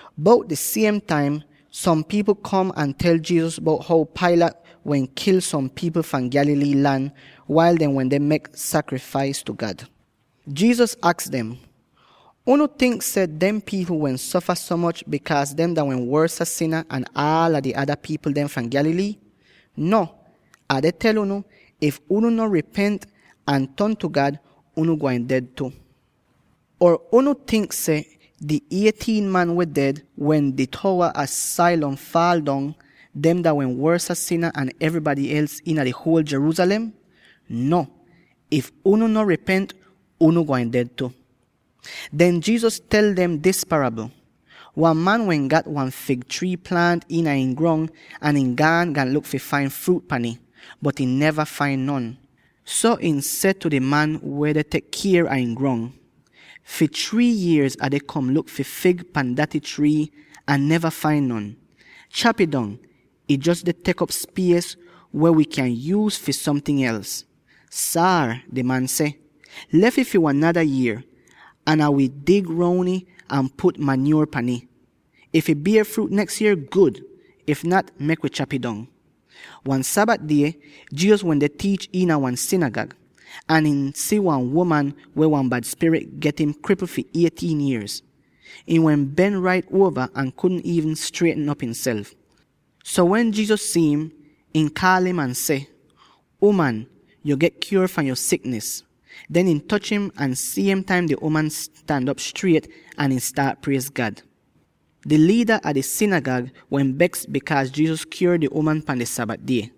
Bout dis siem taim, som pipl kom ahn tel Jesus bout how Pilate wehn kil som pipl fahn Galilee lan, wail dehn wende mek sakrifais tu God. Jesus aks dem, “Unu tink seh dehn pipl wehn sofa so moch bikaaz dehn dah wehn wosa sina an aal di ada pipl dem fahn Galilee? No! Ah deh tel unu: if unu no ripent ahn ton tu God, unu gwain ded tu. Or unu tink seh di eighteen man weh ded, wen di towa ah Siloam faal dong, dehn dah wehn wosa sina an evrybady els iina di huol Jerusalem? No! if unu no ripent, unu gwain ded tu.” Den Jesus tel dem dis parabl, “Wan man wehn gat wan fig trii plaant iina ihn grong, ahn ihn gaan, gaan luk fi fain fruut pan ih, bot ihn neva fain non. So ihn seh tu di man weh tek kier a ihn grong, ‘Fi three yierz Ah deh kom luk fi fig pan daty trii ahn neva fain non. Chap'ih dong! Ih jos deh tek op spies weh wi kyan yuuz fi somting els.’ ‘Saar,’ di man seh, ‘Lef ih wan nada yier, ahn Ai wi dig roun ih ahn put manyuor pan ih. If ih bier fruut neks yier, gud! If nat, mek wi chap'ih dong.’” Wan Sabat die, Jesus wende tiich iina wan sinigag, ahn ihn si wan uman weh wan bad spirit get im kripl fi eighteen yierz. Ihn wehn ben rait uova ahn kudn iivn strietn op ihnself. So wen Jesus si'im, ihn kaal im tu im ahn seh, “Uman, yo get kyuor fahn yo siknis!” Den ihn toch im, ahn siem taim di uman stan op striet, ahn ihn staat priez God! Di liida a di sinigag wehn beks bikaaz Jesus kyuor di uman pan di Sabat die.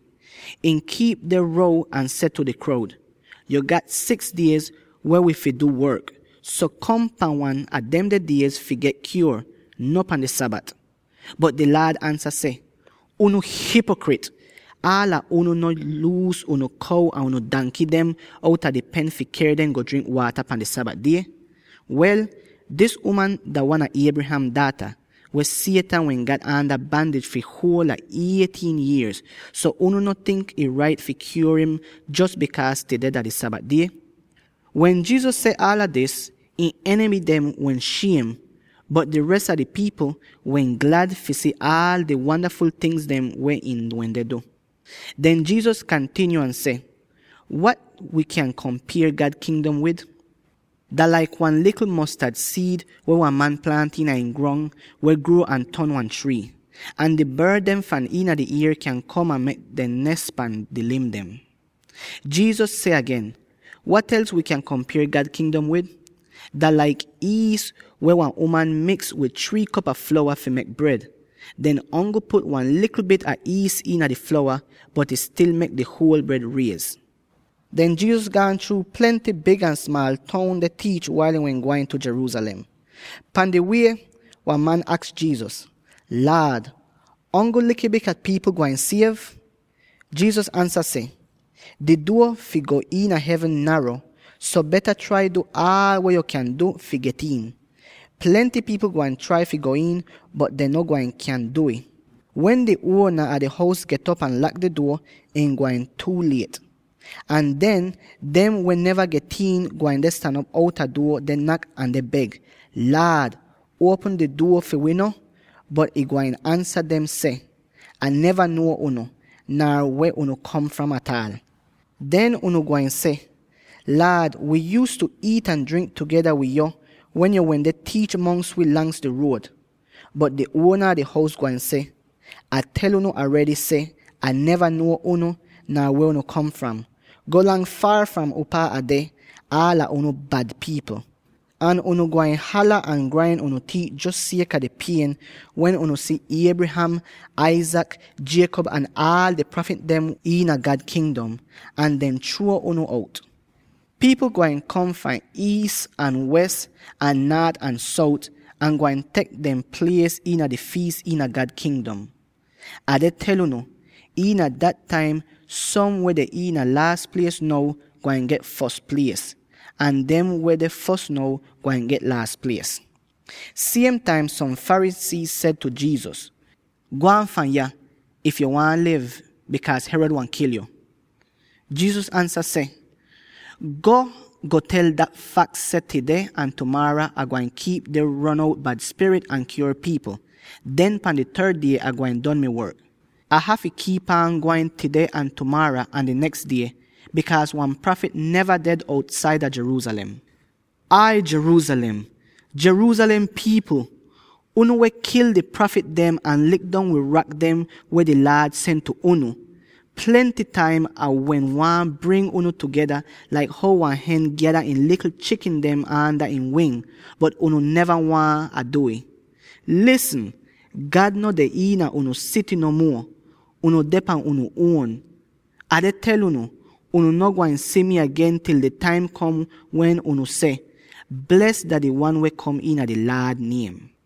Ihn kiip deh row ahn seh tu di kroud, “Yo gat six diez weh wi fi du work, so kom pan wan a demde diez fi get kyuor; no pan di Sabat!” Bot di Laad ansa seh, “Unu hipokrit! Aala unu no luus unu kow or unu danky dem outa di pen fi ker dem go drink waata pan di Sabat die? Wel, dis uman dah wan a Abraham daata, Or: Abraham disendant. weh Satan wehn gat aanda bandij fi huol a eighteen yierz; so unu no tink ih rait fi kyuor im jos bikaaz tudeh dah di Sabat die?” Wen Jesus seh aala dis, ihn enimy dem wehn shiem, bot di res a pipl dem wehn glad fi si aal di wandaful tingz weh ihn wende du. Den Jesus kantinyo ahn seh, “Wat wi kyan kompier God Kingdom wid? Dah laik wan likl mostad siid, weh wan man plaant iina ihn grong, weh gruo ahn ton wan trii. Ahn di bord dem fahn iina di ier kyan kom ahn mek dehn nes pan di lim dem.” Jesus seh agen, “Wat els wi kyan kompier God Kingdom wid? Dah laik iis weh wan uman miks wid three kop a flowa fi mek bred. Dehn ongl put wan likl bit a iis iina di flowa, bot ih stil mek di huol bred riez.” Den Jesus gaan chruu plenty big ahn smaal toun deh tiich, wail ihn wehn gwain Jerusalem. Pan di wie, wan man aks Jesus, “Laad, ongl likl bit a pipl gwain siev?” Jesus ansa seh, “Di duo fi go iina hevn naro, so beta trai du aal weh yo kyan du fi get iin. Plenty pipl gwain trai fi go iin, bot dehn gwain kyaahn du'ih. Wen di uona a di hous get'op ahn lak di duo, ih gwain tuu liet. Ahn den, dem weh neva get iin, gwain deh stan op outa duo deh nak ahn deh beg, ‘Laad, uopm di duo fi wi no!’ Bot ihn gwain ansa dem seh, ‘Ah neva nuo unu, nar weh unu kom fram ataal.’ “Den unu gwain seh, ‘Laad, wi yuuztu iit ahn drink tugeda wid yo, wen yo wende tiich mongs wi lang di ruod!’ Bot di uona a di hous gwain seh, ‘Ah tel unu aredy seh: Ah neva nuo unu, nar weh unu kom fram. Golang faar fahn upaa Ah deh, aala unu bad pipl!’ Ahn unu gwain hala, ahn grain unu tiit jos sieka di pien, wen unu si Abraham, Isaac, Jacob ahn aal di prafit dem iina God Kingdom, ahn dehn chruo unu out. Pipl gwain kom fahn iis ahn wes, ahn naat ahn sout, ahn gwain tek dehn plies iina di fiis iina God Kingdom. Ah deh tel unu: iina dat taim, som weh deh iina laas plies now, gwain get fos plies; ahn dem weh deh fos now, gwain get laas plies.” Siem taim som Pharisee seh tu Jesus, “Gwaan fahn yah, if yo waahn liv, bikaaz Herod waahn kil yo!” Jesus ansa seh, “Go, go tel dah faks seh tudeh ahn tumaara Ah gwain kiip deh ron out bad spirit ahn kyuor pipl; den pan di third die, Ah gwain don mi work. Ah hafy kiip aan gwain tudeh ahn tumaara ahn di neks die, bikaaz wan prafit neva ded outsaida Jerusalem! “Ai Jerusalem, Jerusalem pipl, unu weh kil di prafit dem ahn lik dong wid rak dem weh di Laad sen tu unu! Plenty taim Ah wehn waahn bring unu tugeda, laik how wan hen gyada ihn likl chikin dem aanda ihn wing, bot unu neva waahn Ah du'ih! Lisn! God no deh iina unu sity no muo; unu deh pan unu uon. Or: “…unu hous don get farsiekn.” Ah deh tel unu: unu no gwain si mi agen til di taim kom wen unu seh, ‘Bles dah di Wan weh kom iina di Laad niem.’”